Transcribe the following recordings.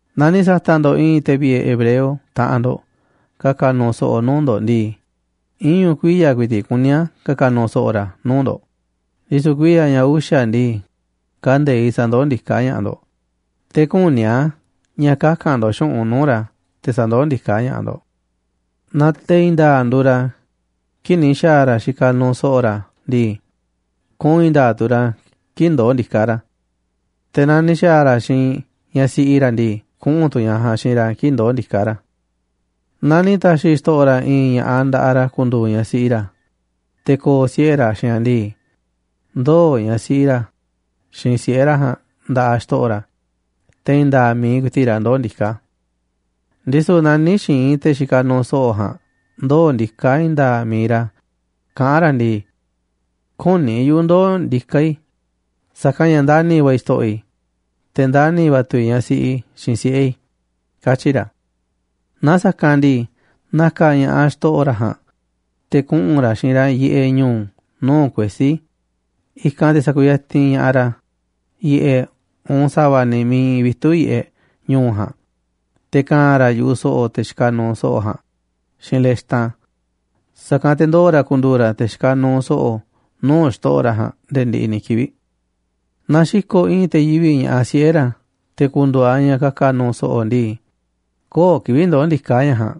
Naaꞌ ni̱ sa̱ta̱ꞌ ndo̱ꞌ i̱i̱n te̱ vi̱ꞌe̱ hebreo, taꞌanꞌ ndo̱ꞌ, ka̱ka̱ nu̱u̱ so̱ꞌo̱ nuu̱ꞌ ndo̱ꞌ ndii, iñu̱ kuiya̱ ku̱i̱ti̱ꞌ kuní a̱ ka̱ka̱ nu̱u̱ so̱ꞌo̱ ra̱ nuu̱ꞌ ndo̱ꞌ, ndisu̱ kuiya̱ ña̱ uxa̱ ndii, kande̱iꞌ sa̱ndoó ndiká ña̱ꞌaꞌ ndo̱ꞌ, te̱ küní a̱ ña̱ kaka̱n ndo̱ꞌ xu̱ꞌunꞌ nuu̱ꞌ ra̱ te̱ sa̱ndoó ndiká ña̱ꞌaꞌ ndo̱ꞌ. Naaꞌ te̱ i̱i̱n nda̱a̱ꞌ nduuꞌ ra̱ kii̱ꞌ ni̱ xa̱a̱ ra̱ xikaꞌ nuuꞌ so̱ꞌo̱ ra̱ ndii, kuꞌu̱n i̱i̱n nda̱a̱ꞌ tu̱ ra̱ kii̱ꞌ ndoo̱ ndiká ra̱. Te̱ naaꞌ ni̱ xa̱a̱ ra̱ xiinꞌ ñaꞌ siꞌi ra̱ ndii, kuꞌu̱n tu̱ ñaꞌ ja̱a̱nꞌ xiinꞌ ra̱ kii̱ꞌ ndoo̱ ndiká ra̱. Naaꞌ ni̱ ta̱xi̱ xto̱ꞌo̱ ra̱ i̱i̱n ña̱ꞌaꞌ nda̱ꞌaꞌ ra̱ ku̱ndu̱u̱ ñaꞌ siꞌi ra̱, te̱ ko̱o̱ siꞌe̱ ra̱ xiinꞌ aꞌ ndii, ndoo̱ ñaꞌ siꞌi ra̱ xiinꞌ siꞌe̱ ra̱ ja̱a̱nꞌ nda̱ꞌaꞌ xto̱ꞌo̱ ra̱, te̱ i̱i̱n nda̱a̱ꞌ mi̱iꞌ ku̱i̱ti̱ꞌ ra̱ ndoo̱ ndiká. Ndisu̱ naaꞌ nï̱ xi̱i̱n te̱ xikaꞌ nuuꞌ so̱ꞌo̱ ja̱a̱nꞌ ndoo̱ ndiká i̱i̱n nda̱a̱ꞌ mi̱iꞌ ra̱, kaꞌán ra̱ ndii: “Küní yuꞌu̱ ndoo̱ ndiká i̱, sa̱kanꞌ ña̱ ndani̱ va̱ i̱ xto̱ꞌo̱ i̱, te̱ ndani̱ va̱ tu̱ i̱ ñaꞌ siꞌi i̱ xiinꞌ siꞌe̱ i̱”, katyi̱ ra̱. Naaꞌ sa̱kanꞌ ndii, na̱ka̱ ña̱ꞌaꞌ xto̱ꞌo̱ ra̱ ja̱a̱nꞌ te̱ kuꞌu̱n ra̱ xiinꞌ ra̱ yiꞌeꞌ ñu̱u̱ nuu̱ꞌ kuesí, i̱kanꞌ te̱ sa̱ku̱yatinꞌ ña̱ꞌaꞌ ra̱ yiꞌeꞌ, uun sa̱va̱ ni̱ miiꞌ iinꞌ vitu̱ꞌ yiꞌeꞌ ñu̱u̱ ja̱a̱nꞌ, te̱ ka̱a̱n ra̱ yu̱ꞌuꞌ so̱ꞌo̱ te̱ xikaꞌ nuuꞌ so̱ꞌo̱ ja̱a̱nꞌ xiinꞌ lextan, sa̱kanꞌ te̱ ndoo̱ ra̱ ku̱ndu̱u̱ ra̱ te̱ xikaꞌ nuuꞌ so̱ꞌo̱ nuu̱ꞌ xto̱ꞌo̱ ra̱ ja̱a̱nꞌ nde̱e̱ ndiꞌiꞌ ni̱ kivi̱ꞌ. ’Naaꞌ xi̱ko̱ꞌ i̱i̱n te̱ yivi̱ꞌ ña̱ꞌaꞌ siꞌe̱ ra̱ te̱ ku̱ndu̱u̱ aꞌ ñaꞌ ka̱ka̱ nu̱u̱ so̱ꞌo̱ ndii, köo̱ꞌ kivi̱ꞌ ndoo̱ ndiká ñaꞌ ja̱a̱nꞌ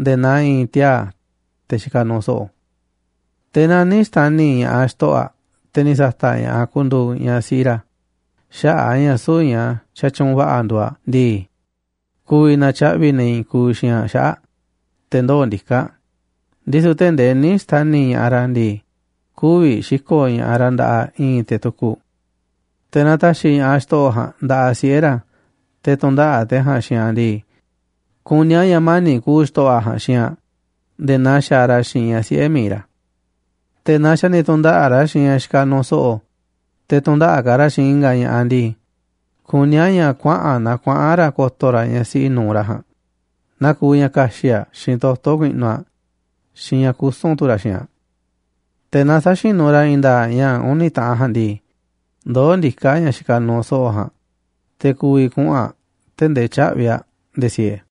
nde̱e̱ naa i̱i̱n tiaa̱, te̱ xikaꞌ nuuꞌ so̱ꞌo̱. Te̱ naaꞌ nï̱ xta̱ni̱ ña̱ꞌaꞌ xto̱ꞌo̱ aꞌ, te̱ ni̱ sa̱ta̱ꞌ ña̱ꞌaꞌ ku̱ndu̱u̱ ñaꞌ siꞌi ra̱ xaꞌa̱ꞌ a̱ ña̱ süu̱ꞌ ñaꞌ xatyuunꞌ va̱ꞌa̱ nduuꞌ aꞌ ndii, ku̱vi̱ na̱tyaꞌvi̱ ne̱ i̱i̱n kuuꞌ xiinꞌ aꞌ xaꞌa̱ꞌ aꞌ te̱ ndoo̱ ndiká aꞌ, ndisu̱ tee̱ꞌ ndee nï̱ xta̱ni̱ ña̱ꞌaꞌ ra̱ ndii, kü̱vi̱ xi̱ko̱ꞌ ña̱ꞌaꞌ ra̱ nda̱ꞌaꞌ i̱i̱n te̱ tukuꞌ. Te̱ naaꞌ ta̱xi̱ ña̱ꞌaꞌ xto̱ꞌo̱ ja̱a̱nꞌ nda̱ꞌaꞌ siꞌe̱ ra̱ te̱ tu̱ndaꞌa̱ꞌ te̱ ja̱a̱nꞌ xiinꞌ aꞌ ndii, kuní a̱ ña̱ mani̱ꞌ ku̱u̱ xto̱ꞌo̱ aꞌ ja̱a̱nꞌ xiinꞌ aꞌ nde̱e̱ naa xaaꞌ ra̱ xiinꞌ ña̱ꞌaꞌ siꞌe̱ mi̱iꞌ ra̱. Te̱ naaꞌ xa̱ ni̱ tu̱ndaꞌa̱ꞌ ra̱ xiinꞌ ñaꞌ xikaꞌ nuuꞌ so̱ꞌo̱, te̱ tu̱ndaꞌa̱ꞌ ka̱ ra̱ xiinꞌ i̱nga̱ ña̱ꞌaꞌ ndii, kuní a̱ ña̱ kuaꞌa̱n na kuaꞌa̱n ra̱ ko̱to̱ ra̱ ñaꞌ siꞌi nu̱uꞌ ra̱ ja̱a̱nꞌ, naaꞌ kuuꞌ ña̱ ka̱xi̱ꞌ aꞌ xiinꞌ toto̱ ku̱i̱ꞌnu̱ aꞌ, xiinꞌ ña̱ kusu̱n tu̱ ra̱ xiinꞌ aꞌ. Te̱ naaꞌ sä̱xinu̱ ra̱ i̱i̱n nda̱a̱ꞌ ña̱ uni̱ taꞌan ja̱a̱nꞌ ndii, ndoó ndiká ñaꞌ xikaꞌ nuuꞌ so̱ꞌo̱ ja̱a̱nꞌ, te̱ ku̱vi̱ kuꞌu̱n aꞌ tee̱ꞌ ndee tyä̱ꞌvi̱ aꞌ nde̱e̱ siee.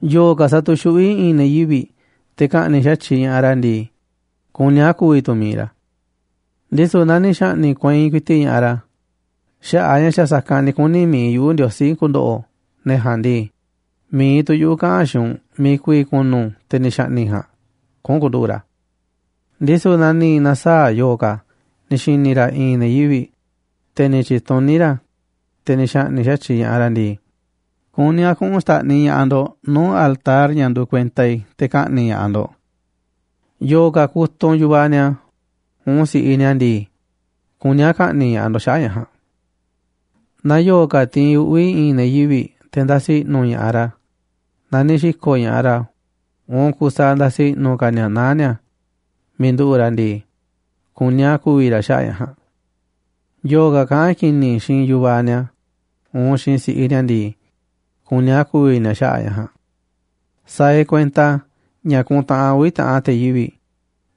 ’Yo̱o̱ ka̱ sa̱tu̱xuꞌví i̱i̱n ne̱ yivi̱ꞌ te̱ ka̱ꞌni̱ꞌ xa̱tyiꞌ ña̱ꞌaꞌ ra̱ ndii, kuní a̱ ku̱vi̱ tu̱ mi̱iꞌ ra̱. Ndisu̱ naaꞌ ni̱ xa̱ꞌni̱ꞌ kueinꞌ ku̱i̱ti̱ꞌ ña̱ꞌaꞌ ra̱ xaꞌa̱ꞌ a̱ ña̱ xa̱ sa̱kanꞌ ni̱ kuni̱ mi̱iꞌ yuꞌu̱ Ndiosí ku̱ndo̱ꞌo̱ ne̱ ja̱a̱nꞌ ndii, mi̱iꞌ tu̱ yuꞌu̱ kaꞌa̱n xiinꞌ u̱nꞌ miiꞌ ku̱vi̱ ku̱nu̱ te̱ ni̱ xa̱ꞌni̱ꞌ ja̱a̱nꞌ kuꞌu̱n ku̱nduꞌu̱ꞌ ra̱. Ndisu̱ naaꞌ ni̱ na̱saa̱ꞌ yo̱o̱ ka̱ ni̱ xi̱ni̱ ra̱ i̱i̱n ne̱ yivi̱ꞌ, te̱ ni̱ tyi̱tuní ra̱, te̱ ni̱ xa̱ꞌni̱ꞌ xa̱tyiꞌ ña̱ꞌaꞌ ra̱ ndii, kuní a̱ kuꞌu̱n xta̱ꞌniꞌ ña̱ꞌaꞌ ndo̱ꞌ nuu̱ꞌ altar ña̱ nduuꞌ kuenta te̱ ka̱ꞌni̱ꞌ ña̱ꞌaꞌ ndo̱ꞌ. ’Yo̱o̱ ka̱ kutunꞌ yu̱vaꞌ ni̱a̱ uun si̱ꞌiꞌ ni̱a̱ ndii, kuní a̱ ka̱ꞌni̱ꞌ ña̱ꞌaꞌ ndo̱ꞌ xaꞌa̱ꞌ ña̱ ja̱a̱nꞌ. ’Naaꞌ yo̱o̱ ka̱ tiinꞌ uꞌvi̱ i̱i̱n ne̱ yivi̱ꞌ te̱ ndasi i̱ꞌnu̱ ña̱ꞌaꞌ ra̱, naaꞌ ni̱ xi̱ko̱ꞌ ña̱ꞌaꞌ ra̱ uun kusaaꞌ ndasiꞌ i̱ꞌnu̱ ka̱ ni̱a̱ naá ni̱a̱ miiꞌ nduꞌu̱ꞌ ra̱ ndii, kuní a̱ ku̱vi̱ ra̱ xaꞌa̱ꞌ ña̱ ja̱a̱nꞌ. ’Yo̱o̱ ka̱ kaꞌán ki̱ni̱ xiinꞌ yu̱vaꞌ ni̱a̱ uun xiinꞌ si̱ꞌiꞌ ni̱a̱ ndii, kuní a̱ ku̱vi̱ ni̱a̱ xaꞌa̱ꞌ ña̱ ja̱a̱nꞌ. ’Sa̱a̱ e̱ꞌ kuenta ña̱ ku̱ntaꞌanꞌ uvi̱ taꞌan te̱ yivi̱ꞌ,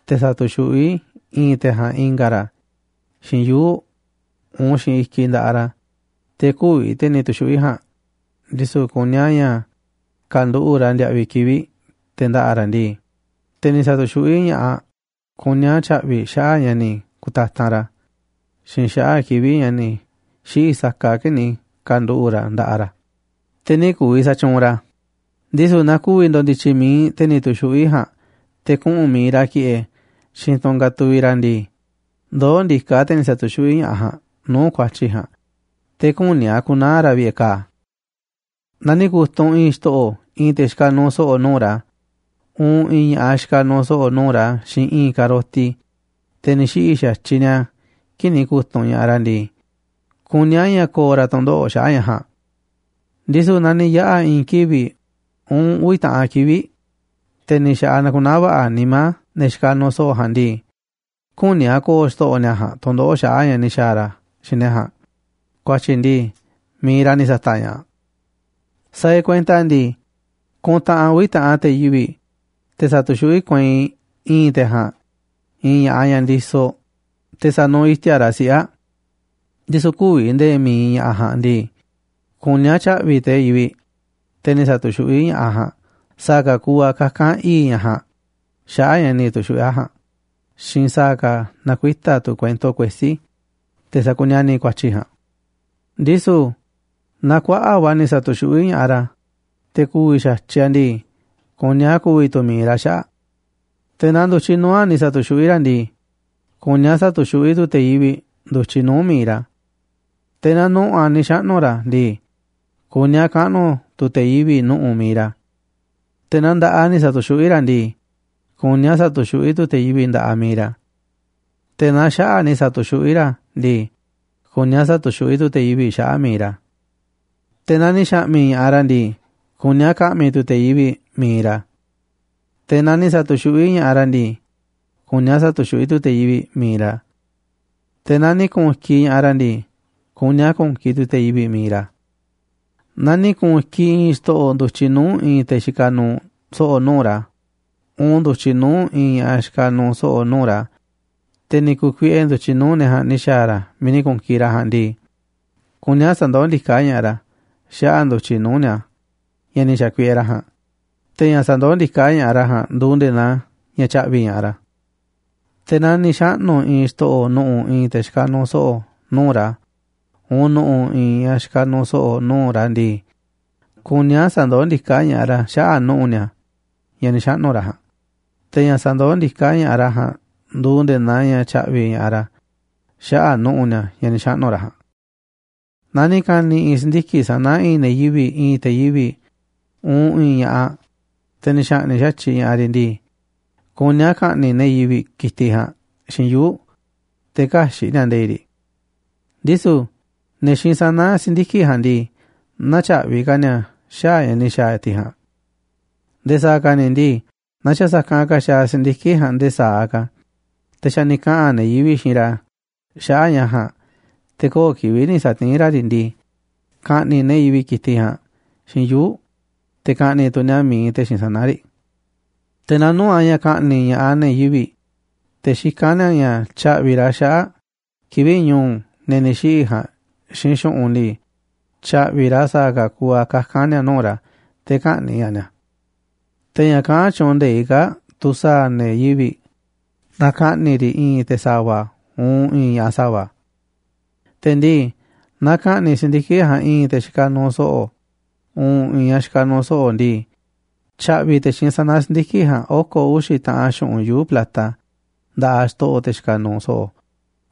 te̱ sa̱tu̱xuꞌví i̱i̱n te̱ ja̱a̱nꞌ i̱nga̱ ra̱ xiinꞌ yuu̱ꞌ uun xiinꞌ i̱kiꞌ nda̱ꞌaꞌ ra̱, te̱ kü̱vi̱ te̱ ni̱ tu̱xuꞌví ja̱a̱nꞌ, ndisu̱ kuní a̱ ña̱ ka̱nduꞌu̱ꞌ ra̱ ndiaꞌviꞌ kivi̱ꞌ te̱ nda̱ꞌa̱ ra̱ ndii, te̱ ni̱ sa̱tu̱xuꞌví ña̱ꞌaꞌ kuní a̱ tya̱ꞌvi̱ xaꞌa̱ꞌ ña̱ ni̱ ku̱tatanꞌ ra̱ xiinꞌ xaꞌa̱ꞌ kivi̱ꞌ ña̱ ni̱ xiꞌi̱ sakaꞌ kii̱ꞌ ni̱ ka̱nduꞌu̱ꞌ ra̱ ndaꞌa ra̱, te̱ nï̱ ku̱vi̱ sa̱tyuunꞌ ra̱. Ndisu̱ naaꞌ ku̱vi̱ ndo̱ndi̱tyi̱ mi̱iꞌ te̱ ni̱ tu̱xuꞌví ja̱a̱nꞌ te̱ kuꞌu̱n mi̱iꞌ ra̱ ki̱ꞌe̱ xiinꞌ i̱i̱n tunꞌ katuviꞌ ndii, ndoo̱ ndiká te̱ ni̱ sa̱tu̱xuꞌví ña̱ꞌaꞌ ja̱a̱nꞌ nuu̱ꞌ ku̱a̱tyi̱ ja̱a̱nꞌ, te̱ küní a̱ ku̱naa̱ ra̱ vi̱ꞌe̱ ka̱a̱. ’Naaꞌ ni̱ ku̱tunꞌ i̱i̱n xto̱ꞌo̱ i̱i̱n te̱ xikaꞌ nuuꞌ so̱ꞌo̱ nuu̱ꞌ ra̱ uun i̱i̱n ña̱ꞌaꞌ ñaꞌ xikaꞌ nuuꞌ so̱ꞌo̱ nuu̱ꞌ ra̱ xiinꞌ i̱i̱n ka̱roti, te̱ ni̱ xiꞌi̱ xa̱tyiꞌ ni̱a̱ kii̱ꞌ ni̱ ku̱tunꞌ ña̱ꞌaꞌ ra̱ ndii, kuní a̱ ña̱ ko̱o̱ ra̱ tu̱ndoꞌo̱ꞌ xaꞌa̱ꞌ ña̱ ja̱a̱nꞌ. Ndisu̱ naaꞌ ni̱ yaꞌa̱ i̱i̱n kivi̱ꞌ uun uvi̱ taꞌan kivi̱ꞌ, te̱ ni̱ xa̱ꞌaꞌ nakunaá va̱ꞌa̱ nimá ne̱ xikaꞌ nuuꞌ so̱ꞌo̱ ja̱a̱nꞌ ndii, küní a̱ ko̱o̱ xto̱ꞌo̱ ni̱a̱ ja̱a̱nꞌ tu̱ndoꞌo̱ꞌ xaꞌa̱ꞌ ña̱ ni̱ xa̱a̱ ra̱ xiinꞌ ne̱ ja̱a̱nꞌ ku̱a̱tyi̱ ndii, mi̱iꞌ ra̱ ni̱ sa̱ta̱ꞌ ña̱ꞌaꞌ. ’Sa̱a̱ e̱ꞌ kuenta ndii, kuntaꞌanꞌ uvi̱ taꞌan te̱ yivi̱ꞌ, te̱ sa̱tu̱xuꞌví kueinꞌ i̱i̱n te̱ ja̱a̱nꞌ i̱i̱n ña̱ꞌaꞌ ñaꞌ ndisoꞌ, te̱ sa̱nuuꞌ iti̱a̱ꞌ ra̱ siꞌe̱ aꞌ, ndisu̱ kü̱vi̱ nde̱e̱ mi̱iꞌ ña̱ꞌaꞌ ja̱a̱nꞌ ndii, kuní a̱ tya̱ꞌvi̱ te̱ yivi̱ꞌ, te̱ ni̱ sa̱tu̱xuꞌví ña̱ꞌaꞌ ja̱a̱nꞌ, sa̱a̱ ka̱ kuuꞌ a̱ kaka̱n i̱i̱ꞌ ñaꞌ ja̱a̱nꞌ xaꞌa̱ꞌ ña̱ ni̱ tu̱xuꞌví aꞌ ja̱a̱nꞌ xiinꞌ sa̱a̱ ka̱ na̱kuita̱ tu̱ kuento kuesí, te̱ sakuniani̱ ku̱a̱tyi̱ ja̱a̱nꞌ. Ndisu̱ naaꞌ kuaꞌa̱ꞌ va̱ ni̱ sa̱tu̱xuꞌví ña̱ꞌaꞌ ra̱, te̱ ku̱vi̱ xa̱tyiꞌ aꞌ ndii, kuní a̱ ku̱vi̱ tu̱ mi̱iꞌ ra̱ xaꞌa̱ꞌ aꞌ. Te̱ naaꞌ ndu̱tyiꞌ nuu̱ꞌ aꞌ ni̱ sa̱tu̱xuꞌví ra̱ ndii, kuní a̱ sa̱tu̱xuꞌví tu̱ te̱ yivi̱ꞌ ndu̱tyiꞌ nuu̱ꞌ mi̱iꞌ ra̱. Te̱ naaꞌ nu̱ꞌu̱ aꞌ ni̱ xaꞌnu̱ ra̱ ndii, kuní a̱ kaꞌnu̱ tu̱ te̱ yivi̱ꞌ nu̱ꞌu̱ mi̱iꞌ ra̱. Te̱ naaꞌ nda̱ꞌaꞌ aꞌ ni̱ sa̱tu̱xuꞌví ra̱ ndii, kuní a̱ sa̱tu̱xuꞌví tu̱ te̱ yivi̱ꞌ nda̱ꞌaꞌ mi̱iꞌ ra̱. Te̱ naaꞌ xaꞌa̱ꞌ aꞌ ni̱ sa̱tu̱xuꞌví ra̱ ndii, kuní a̱ sa̱tu̱xuꞌví tu̱ te̱ yivi̱ꞌ xaꞌa̱ꞌ mi̱iꞌ ra̱. Te̱ naaꞌ ni̱ xa̱ꞌmi̱ ña̱ꞌaꞌ ra̱ ndii, kuní a̱ ka̱ꞌmi̱ tu̱ te̱ yivi̱ꞌ mi̱iꞌ ra̱. Te̱ naaꞌ ni̱ sa̱tu̱xuꞌví ña̱ꞌaꞌ ra̱ ndii, kuní a̱ sa̱tu̱xuꞌví tu̱ te̱ yivi̱ꞌ mi̱iꞌ ra̱. Te̱ naaꞌ ni̱ ku̱u̱n i̱kiꞌ ña̱ꞌaꞌ ra̱ ndii, kuní a̱ ku̱u̱n i̱kiꞌ tu̱ te̱ yivi̱ꞌ mi̱iꞌ ra̱. ’Naaꞌ ni̱ ku̱u̱n i̱kiꞌ i̱i̱n xto̱ꞌo̱ ndu̱tyiꞌ nuu̱ꞌ i̱i̱n te̱ xikaꞌ nuuꞌ so̱ꞌo̱ nuu̱ꞌ ra̱ uun ndu̱tyiꞌ nuu̱ꞌ i̱i̱n ñaꞌ xikaꞌ nuuꞌ so̱ꞌo̱ nuu̱ꞌ ra̱, te̱ ni̱ ku̱kuiꞌe ndu̱tyiꞌ nuu̱ꞌ ne̱ ja̱a̱nꞌ ni̱ xa̱a̱ ra̱ miiꞌ ni̱ ku̱u̱n i̱kiꞌ ra̱ ja̱a̱nꞌ ndii, kuní a̱ sa̱ndoó ndiká ña̱ꞌaꞌ ra̱ xaꞌa̱ꞌ ndu̱tyiꞌ nuu̱ꞌ ni̱a̱ ña̱ ni̱ xa̱kuiꞌe ra̱ ja̱a̱nꞌ, te̱ ña̱ sandoó ndiká ña̱ꞌaꞌ ra̱ ja̱a̱nꞌ nduuꞌ nde̱e̱ naa ña̱ tya̱ꞌvi̱ ña̱ꞌaꞌ ra̱. Te̱ naaꞌ ni̱ xaꞌnu̱ i̱i̱n xto̱ꞌo̱ nu̱ꞌu̱ i̱i̱n te̱ xikaꞌ nuuꞌ so̱ꞌo̱ nuu̱ꞌ ra̱ uun nu̱ꞌu̱ i̱i̱n ñaꞌ xikaꞌ nuuꞌ so̱ꞌo̱ nuu̱ꞌ ra̱ ndii, kuní a̱ sa̱ndoó ndiká ña̱ꞌaꞌ ra̱ xaꞌa̱ꞌ nu̱ꞌu̱ ni̱a̱, ña̱ ni̱ xaꞌnu̱ ra̱ ja̱a̱nꞌ, te̱ ña̱ sandoó ndiká ña̱ꞌaꞌ ra̱ ja̱a̱nꞌ nduuꞌ nde̱e̱ naa ña̱ tya̱ꞌvi̱ ña̱ꞌaꞌ ra̱ xaꞌa̱ꞌ nu̱ꞌu̱ ni̱a̱, ña̱ ni̱ xaꞌnu̱ ra̱ ja̱a̱nꞌ. ’Naaꞌ ni̱ ka̱ni̱ i̱i̱n si̱ndiki̱ꞌ sana̱ i̱i̱n ne̱ yivi̱ꞌ, i̱i̱n te̱ yivi̱ꞌ uun i̱i̱n ña̱ꞌaꞌ, te̱ ni̱ xa̱ꞌni̱ꞌ xa̱tyiꞌ ña̱ꞌaꞌ riꞌ ndii, kuní a̱ ka̱ꞌni̱ꞌ ne̱ yivi̱ꞌ ki̱tiꞌ ja̱a̱nꞌ xiinꞌ yuu̱ꞌ, te̱ kä̱xi̱ꞌ ni̱a̱ nde̱i̱ꞌ riꞌ. Ndisu̱ ne̱ xiinꞌ sana̱ si̱ndiki̱ꞌ ja̱a̱nꞌ ndii, nä̱tyaꞌvi̱ ka̱ ni̱a̱ xaꞌa̱ꞌ ña̱ ni̱ xa̱a̱ tiꞌ ja̱a̱nꞌ. Nde̱e̱ sa̱a̱ ka̱ ni̱ ndii, naaꞌ xa̱ sa̱kanꞌ ka̱ xaaꞌ si̱ndiki̱ꞌ ja̱a̱nꞌ nde̱e̱ sa̱aꞌ ka̱, te̱ xa̱ ni̱ kaꞌa̱n ne̱ yivi̱ꞌ xiinꞌ ra̱ xaꞌa̱ꞌ ña̱ ja̱a̱nꞌ, te̱ köo̱ꞌ kivi̱ꞌ ni̱ sa̱tiín ra̱ riꞌ ndii, ka̱ꞌni̱ꞌ ne̱ yivi̱ꞌ ki̱tiꞌ ja̱a̱nꞌ xiinꞌ yuu̱ꞌ, te̱ ka̱ꞌni̱ꞌ tu̱ ni̱a̱ mi̱iꞌ te̱ xiinꞌ sana̱ riꞌ. Te̱ naaꞌ nuu̱ꞌ a̱ ña̱ ka̱ꞌni̱ꞌ ña̱ꞌaꞌ ne̱ yivi̱ꞌ, te̱ xikán ni̱a̱ ña̱ tya̱ꞌvi̱ ra̱ xaꞌa̱ꞌ kivi̱ꞌ ñu̱u̱ ne̱ ni̱ xiꞌi̱ ja̱a̱nꞌ xiinꞌ xu̱ꞌunꞌ ndii, tya̱ꞌvi̱ ra̱ sa̱a̱ ka̱ kuuꞌ a̱ kaka̱n ni̱a̱ nuu̱ꞌ ra̱, te̱ kä̱ꞌni̱ꞌ ña̱ꞌaꞌ ni̱a̱. Te̱ ña̱ kaꞌán tyuunꞌ nde̱iꞌ kaa̱ꞌ tu̱ sa̱a̱ ne̱ yivi̱ꞌ naaꞌ ka̱ꞌni̱ꞌ riꞌ i̱i̱n te̱ sa̱va̱ uun i̱i̱n ña̱ꞌaꞌ sa̱va̱. Te̱ ndii, naaꞌ ka̱ꞌni̱ꞌ si̱ndiki̱ꞌ ja̱a̱nꞌ i̱i̱n te̱ xikaꞌ nuuꞌ so̱ꞌo̱ uun i̱i̱n ña̱ꞌaꞌ xikaꞌ nuuꞌ so̱ꞌo̱ ndii, tya̱ꞌvi̱ te̱ xiinꞌ sana̱ si̱ndiki̱ꞌ ja̱a̱nꞌ oko̱ uxi̱ taꞌan xu̱ꞌunꞌ yuu̱ꞌ plata nda̱ꞌaꞌ xto̱ꞌo̱ te̱ xikaꞌ nuuꞌ so̱ꞌo̱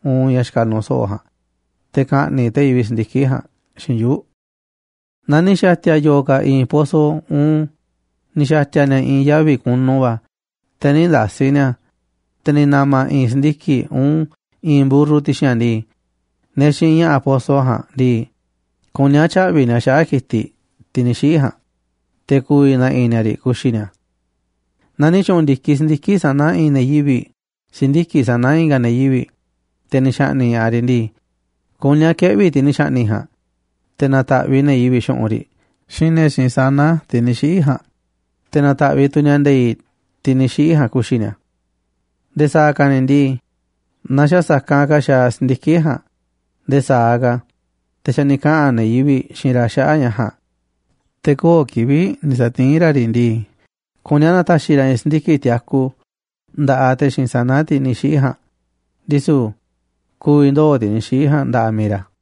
uun ñaꞌ xikaꞌ nuuꞌ so̱ꞌo̱ ja̱a̱nꞌ, te̱ ka̱ꞌni̱ꞌ te̱ yivi̱ꞌ si̱ndiki̱ꞌ ja̱a̱nꞌ xiinꞌ yuu̱ꞌ. ’Naaꞌ ni̱ xa̱ti̱a̱ yo̱o̱ ka̱ i̱i̱n poso uun ni̱ xa̱ti̱a̱ ni̱a̱ i̱i̱n yavi̱ kunu va̱ te̱ nï̱ nda̱si̱ ni̱a̱ a̱, te̱ ni̱ na̱ma̱ i̱i̱n si̱ndiki̱ꞌ uun i̱i̱n mburru ti̱xi̱n a̱ ndii, ne̱ xiinꞌ ña̱ꞌa̱ poso ja̱a̱nꞌ ndii, kuní a̱ tya̱ꞌvi̱ ni̱a̱ xaꞌa̱ꞌ ki̱tiꞌ, tiꞌ ni̱ xiꞌi̱ ja̱a̱nꞌ, te̱ ku̱vi̱ na̱ꞌi̱ ni̱a̱ riꞌ ku̱xi̱ ni̱a̱. ’Naaꞌ ni̱ tyu̱ꞌu̱n ndi̱kiꞌ si̱ndiki̱ꞌ sana̱ i̱i̱n ne̱ yivi̱ꞌ si̱ndiki̱ꞌ sana̱ i̱nga̱ ne̱ yivi̱ꞌ, te̱ ni̱ xa̱ꞌni̱ꞌ ña̱ꞌaꞌ riꞌ ndii, kuní a̱ keꞌvi̱ tiꞌ ni̱ xa̱ꞌni̱ꞌ ja̱a̱nꞌ, te̱ na̱ta̱ꞌviꞌ ne̱ yivi̱ꞌ xu̱ꞌunꞌ riꞌ xiinꞌ ne̱ xiinꞌ sana̱ tiꞌ ni̱ xiꞌi̱ ja̱a̱nꞌ, te̱ na̱ta̱ꞌviꞌ tu̱ ni̱a̱ nde̱i̱ꞌ tiꞌ ni̱ xiꞌi̱ ja̱a̱nꞌ ku̱xi̱ ni̱a̱. Nde̱e̱ sa̱a̱ ka̱ ni̱ ndii, naaꞌ xa̱ sa̱kanꞌ ka̱ xaaꞌ si̱ndiki̱ꞌ ja̱a̱nꞌ nde̱e̱ sa̱aꞌ ka̱, te̱ xa̱ ni̱ kaꞌa̱n ne̱ yivi̱ꞌ xiinꞌ ra̱ xaꞌa̱ꞌ ña̱ ja̱a̱nꞌ, te̱ köo̱ꞌ kivi̱ꞌ ni̱ sa̱tiín ra̱ riꞌ ndii, kuní a̱ na̱ta̱xi̱ ra̱ i̱i̱n si̱ndiki̱ꞌ tiaku nda̱ꞌaꞌ te̱ xiinꞌ sana̱, tiꞌ ni̱ xiꞌi̱ ja̱a̱nꞌ, ndisu̱ ku̱vi̱ ndoo̱ tiꞌ ni̱ xiꞌi̱ ja̱a̱nꞌ nda̱ꞌaꞌ mi̱iꞌ ra̱.